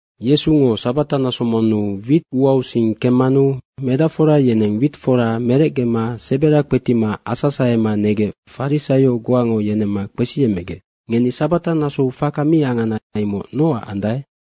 Yesungo sabata naso monnu wit uausing kemmanu medacfora yeneng wit fora merecgema sebera kpetima asasahema negec farisaio goango yenemma kpesiyemmegec, “Ngeni sabata nasou faka mi angana imoc nocac andae?”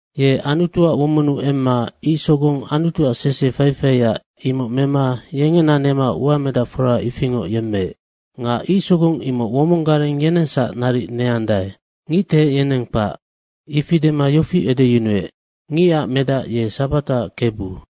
Ye Anutuac womonnu emma ic sogong Anutuac sese faifaia, imoc mema yengena nema uamedacfora ifingoc yemmeec. Nga ic sogong imoc womong gareng yenengsac naric neandae, ngictehec yeneng kpac.” Ifi dema yofi edeyunuec, “Ngicac Medac ye sabataac Kebu.”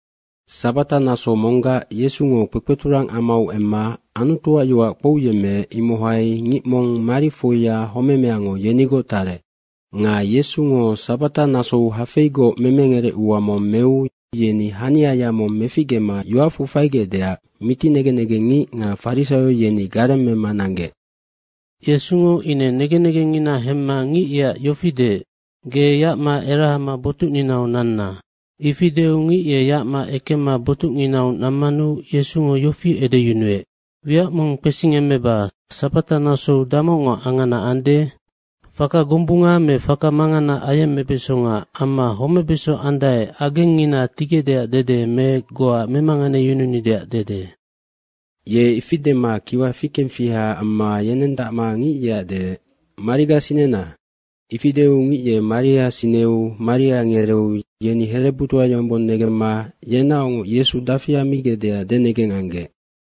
Sabata naso monggac Yesungo kpekpeturang amau emma Anutuac yoac kpouyemmeec, imohai ngic mong marifoia homemeango yenigoc tarec. Nga Yesungo sabata nasou hafeigoc memengerecua mong meu yeni haniaya mong meficgema yoacfu faigecdeac miti negen negenngic nga farisaio, yeni garemmema nanggec. Yesungo ine negen negengngina hemma ngic yeac yofi deec, “Ge yacma erahama botucninau nanna.” Ifi deu ngic ye yacma ekemma botucnginau nammanu Yesungo yofi edeyunuec, “Wiac mong kpesingemmeba, sabatanasou damocngo angana ande? Faka gombunga me faka mangana ayemmebesonga amma homebeso andae, agengngina tigecdeac dede me goa memanganeyununideac dede?” Ye ifi dema kiwa fikengfiha amma yenendacma ngic yeac deec, “Mariga sinena.” Ifi deu ngic ye maria sineu maria ngereeu yeni herebutoa yombong negemma yenaocngoc Yesu dafi ammigecdeac denegeng anggec.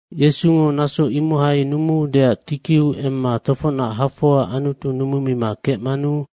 Yesungo naso imohai numuudeac tikiu emma tofocnac hafoa Anutu numumima kecmanu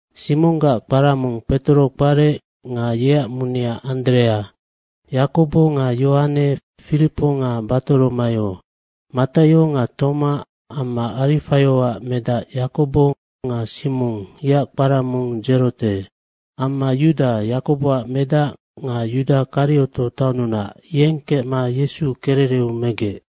Simonggac kpara mong Petoro kparec nga yeac munea Anderea, Yakobo nga Yohane, Firipo nga Batoromaio. Mataio nga Toma amma Arifaioac medac Yakobo nga Simong, yeac kpara mong Dzerote. Amma Yuda, Yakoboac medac nga Yuda Karioto taonnunac, yeng kecma Yesu kerereu megec.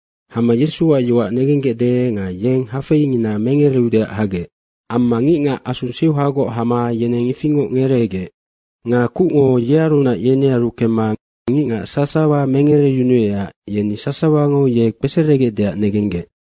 Hama Yesuac yoac negenggecde nga yeng hafeingina mengereudeac hagec. Amma ngicngac asu seuhagoc hama yeneng ifingoc ngereegec. Nga kucngo yearunac yenearu kemma ngicngac sasawa mengereyunuecac yeni sasawango ye kpeseregecdeac negenggec.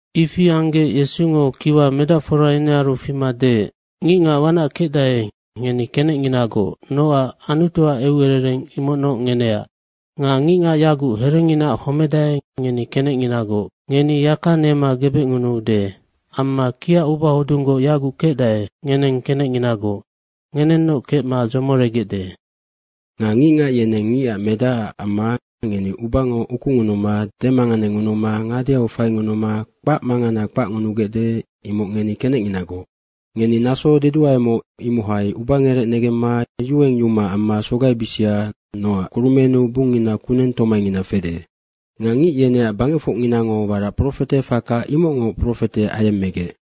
Ifi anggec Yesungo kiwa medacfora yenearu fima deec, “Ngicngac wanac kecdae, ngeni kenecnginagoc, nocac Anutuac eucerereng imocnoc ngeneac. Nga ngicngac yaguc herenginaac homedae, ngeni kenecnginagoc, ngeni yaka nema gebecngunuude. Amma kiac ubahodunggoc yaguc kecdae, ngeneng kenecnginagoc, ngenennoc kecma dzomoregecde. Nga ngicngac yeneng Ngicac Medacac amma ngeni ubango ukungunuma demanganengunuma ngadeau faingunuma kpac mangana kpacngunugecde, imoc ngeni kenecnginagoc. Ngeni naso deduaemoc, imohai ubangerec negemma yuengyuma amma sogaibisia, nocac kurumennu bungngina kuneng tomaingina fede. Nga ngic yeneac bangecfocnginango warac profete faka imocngoc profete ayemmegec.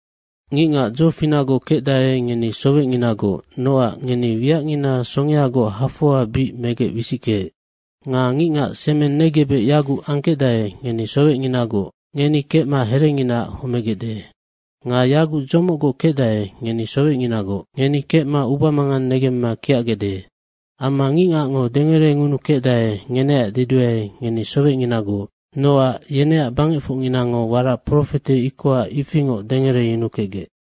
Ngicngac dzofinacgoc kecdae, ngeni sowecnginagoc, nocac ngeni wiacngina songeagoc hafoa bic megec wisickeec. Nga ngicngac semeng negebec yaguc angkecdae, ngeni sowecnginagoc. Ngeni kecma herenginaac homegecde. Nga yaguc dzomocgoc kecdae, ngeni sowecnginagoc. Ngeni kecma ubamangang negemma kiacgecde. Amma ngicngacngo dengerengunukecdae, ngeneac deduae, ngeni sowecnginagoc, nocac yeneac bangecfocnginango warac profete ikoha ifingoc dengereyunukecgec.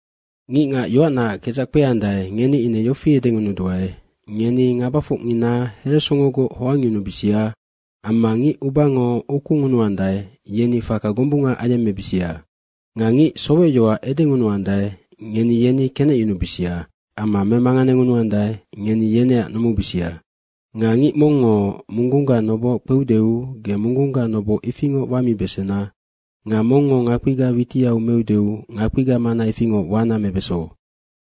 Ngicngac yoacnaac kedzac kpeandae, ngeni ine yofi edengunuduae, ngeni ngabafocngina heresongogoc hoangyunubisia amma ngic ubango ukungunuandae, yeni faka gombunga ayemmebisia. Nga ngic sowecyoac edengunuandae, ngeni yeni kenecyunubisia amma memanganengunuandae, ngeni yeneac numubisia. Nga ngic mongngo munggungga noboc kpeudeu ge munggungga noboha ifingoc wamibesena nga mongngo ngakpiga witiau meudeu ngakpiga mana ifingoc wana mebeso.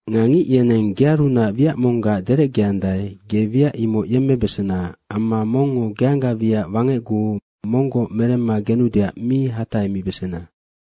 Nga ngic yeneng gearunac wiac monggac derecgeandae, ge wiac imoc yemmebesena amma mongngo geangga wiac wangecguu monggoc meremma genudeac mi hatahemibesena.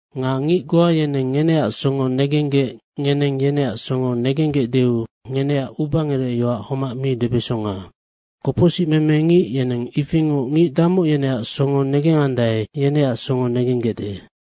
Nga ngic goa yeneng ngeneac songo negenggec ngeneng yeneac songo negenggecdeu ngeneac ubangerecyoac homac mi debesonga. Kopocsicmeme ngic yeneng ifingoc ngic damoc yeneac songo negengandae, yeneac songo negenggecde.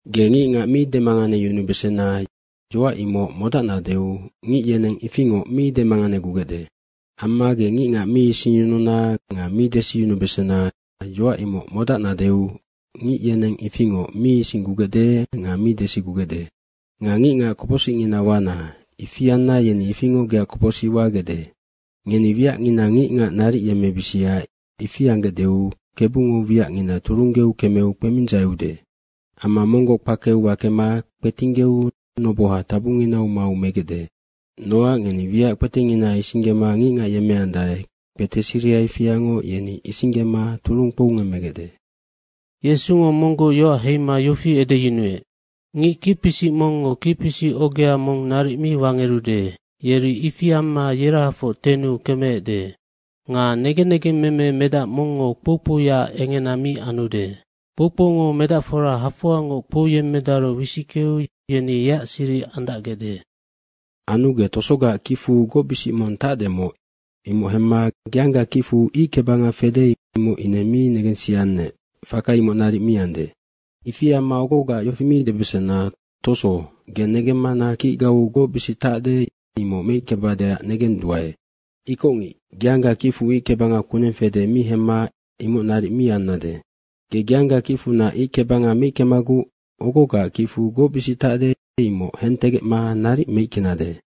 “Ge ngicngac mi demanganeyunubesena, yoac imoc modacnadeu ngic yeneng ifingoc mi demanganegugecde. Amma ge ngicngac mi isingyununa nga mi desiyunubesena, yoac imoc modacnadeu ngic yeneng ifingoc mi isinggugecde nga mi desigugecde. Nga ngicngac kopocsicngina wana. Ifi anna yeni ifingoc geac kopocsic wagecde. Ngeni wiacngina ngicngac naric yemmebisia, ifi anggecdeu, Kebungo wiacngina turunggeu kemeu kpemindzaiude. Amma monggoc kpakeu wakema kpetinggeu noboha tabunginau mau megecde. Nocac ngeni wiac kpetengina isinggema ngicngac yemmeandae, kpete siriha ifiangoc yeni isinggema turung kpoungemmegecde.” Yesungo monggoc yoac heima yofi edeyunuec, “Ngic kicpisic mongngo kicpisic ogea mong naric mi wangerude, yeri ifi amma yerahafoc tennu kemeecde. Nga negen negengmeme medac mongngo kpoukpouyaac engena mi anude. Kpoukpoungo medacfora hafoangoc kpouyemmedaru wisickeu yeni yeac siric andacgecde. Anu ge tosogaac kicfu gocbisic mong tacdemoc, imoc hemma geangga kicfu ic kebanga fede, imoc ine mi negensiannec, faka imoc naric mi ande. Ifi amma ogogaac yofi mi debesena, ‘Toso, ge negemmana kicgau gocbisic tacde, imoc meickebadeac negenduae.’ Ikocngic, geangga kicfu ic kebanga kuneng fede mi hemma imoc naric mi annade. Ge geangga kicfunac ic kebanga meickemaguc ogogaac kicfu gocbisic tacde, imoc hentegecma naric meickenade.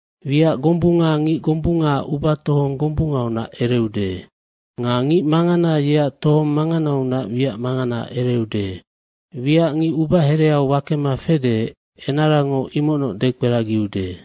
Wiac gombunga ngic gombungaac ubatohong gombungaunac ereude. Nga ngic mangana yeac tohong manganaunac wiac mangana ereude. Wiac ngic ubahereau wakema fede, enarango imocnoc dekperagiude.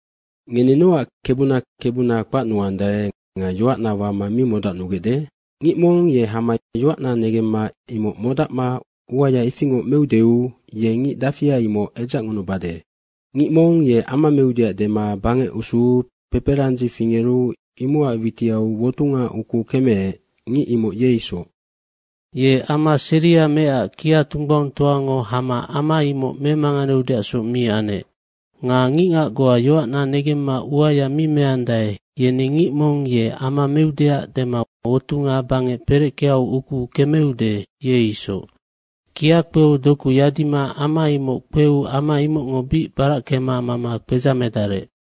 Ngeni nocac Kebuna Kebuna kpacnuandae nga yoacna wama mi modacnugecde? Ngic mong ye hama yoacna negemma imoc modacma uaya ifingoc meudeu, ye ngic dafia, imoc edzacngunubade. Ngic mong ye ama meudeac dema bangec usuu peperandzi fingeru imocac witiau wotunga ukuu kemeec, ngic imoc ye isoc. Ye ama seria meecac kia tunggbaungtoango hama ama imoc memanganeudeacsoc mi anec. Nga ngicngac goa yoacna negemma uaya mi meandae, yeni ngic mong ye ama meudeac dema wotunga bangec pereckeau ukuu kemeude, ye isoc. Kia kpeu doku yadima ama imoc kpeu ama imocngo bic barackema mama kpedzamedarec.”